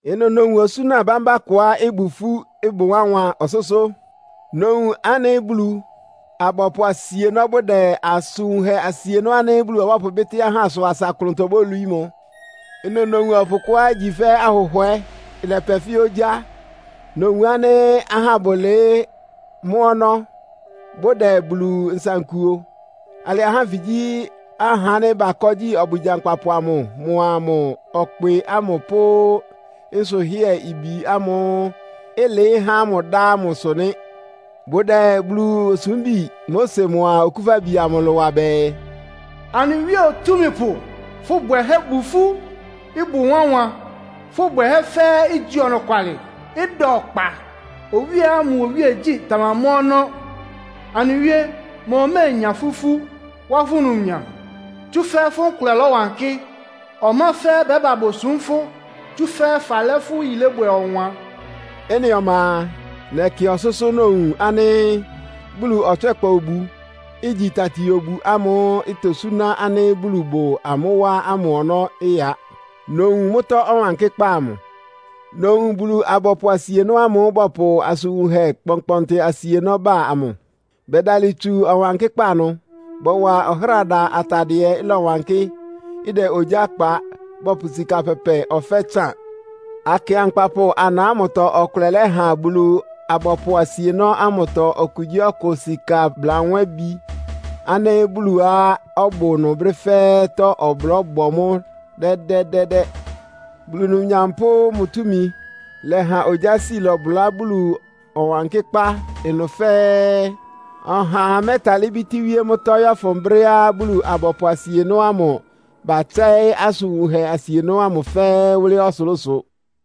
Ɩnʋ nowun osúna bámbá kʋá ɩbʋ ifú, ɩbʋ wánwan ɔsʋ́sʋ́. Nowun ánɩ́ Bulu-abɔpʋ asienɔ́ bʋdɛ asʋn wunhɛ asienɔ́ ánɩ́ Bulu ɔbɔ́pʋbɩ́tɩ́ ahá ɩsʋ asa ɩklʋntɔ bólwií mʋ. Ɩnʋ nowun ɔpʋ kʋá igyi fɛ́ ahʋhwɛ́, ɩlɛpɛ fɛ́ ogyá. Nowun ánɩ́ ahá bʋlɩɩ́ mʋ́ ɔnɔ́, bʋdɛ Bulu nsankuo. Alɩ ahá ánfɩ gyí ahá ánɩ́ bakɔ́ gyi ɔbwɩ gyankpapʋ amʋ mʋa mʋ ɔkpɩ ámʋ pʋ́ nsʋhɩ́ɛ-ibi ámʋ́ʋ́ ɩlɩɩ́ há mʋ dá ámʋsʋ nɩ́. Bʋdɛ Bulu osúmbi Mose mʋa Okúfabi amʋ ɩlʋ wa bɛɛ, “Anɩ Wíe Otúmípʋ, fʋ́ bwɛhɛ́ bʋ ifú, ɩbʋ wánwan. Fʋ́ bwɛhɛ́ fɛ́ɛ́ igyi ɔnɔkwalɩ, ɩda ɔkpa. Owíeá mʋ iwíegyí tamamɔ́ ɔnɔ́. Anɩ Wíe, ma oméenya fʋ́ ifú, wá fʋ́ numnyam? Tsúfɛ́ fʋ́ nkʋlɛ lɔ́wankɩ́. Ɔma fɛ́ɛ́ bɛ́ba bosúm fʋ́, tsúfɛ́ falɛ́ fʋ́ yilébwɛ ɔwan.” Ɩ́nɩ ɔma a, nɛkɩ ɔsʋ́sʋ́, nowun ánɩ́ Bulu ɔtswɛ́kpa obu, igyi tati-obu ámʋ́ʋ́ itosúná ánɩ́ Bulu bʋ amʋ́ wá ámʋ ɔnɔ́ ɩya. Nowun mʋ́tɔ́ Ɔwankɩ́kpá amʋ. Nowun Bulu-abɔpʋ asienɔ́ amʋ́ʋ́ bɔpʋ asʋn wunhɛ kpɔnkpɔntɩ asienɔ́ bá amʋ. Bɛdalɩ tsu Ɔwankɩ́kpá ɩnʋ. Bɔwa ɔhráda atadɩɛá ɩlɔwankɩ́, ɩdɛ ogyá kpa, bɔpʋ sika pɛpɛ ɔfɛ́ tsán. Akɩankpapʋ ana ámʋtɔ ɔkʋlɛ lɛ́ha Bulu-abɔpʋ asienɔ́ ámʋtɔ okugyíɔkʋ sika blanwébi ánɩ́ Buluá ɔbʋ ɩnʋ brɛ́ fɛ́ɛ́tɔ́ ɔblɔ́ ɩbɔ mʋ́ dɛ́dɛ́dɛ́dɛ́. Bulu numnyam pʋ́ mʋ túmi lɛha ogyási lɔbʋlá Bulu Ɔwankɩ́kpá ɩnʋ fɛ́ɛ́. Ɔhaa mɛ́talɩ́ bítíwíé mʋ́tɔ́, yɔ́fʋn brɛ́á Bulu-abɔpʋ asienɔ́ ámʋ batsɛ́ɩ́ asʋn wunhɛ asienɔ́ ámʋ fɛ́ɛ́ wʋ́lɩ́ ɔsʋlʋ́sʋ.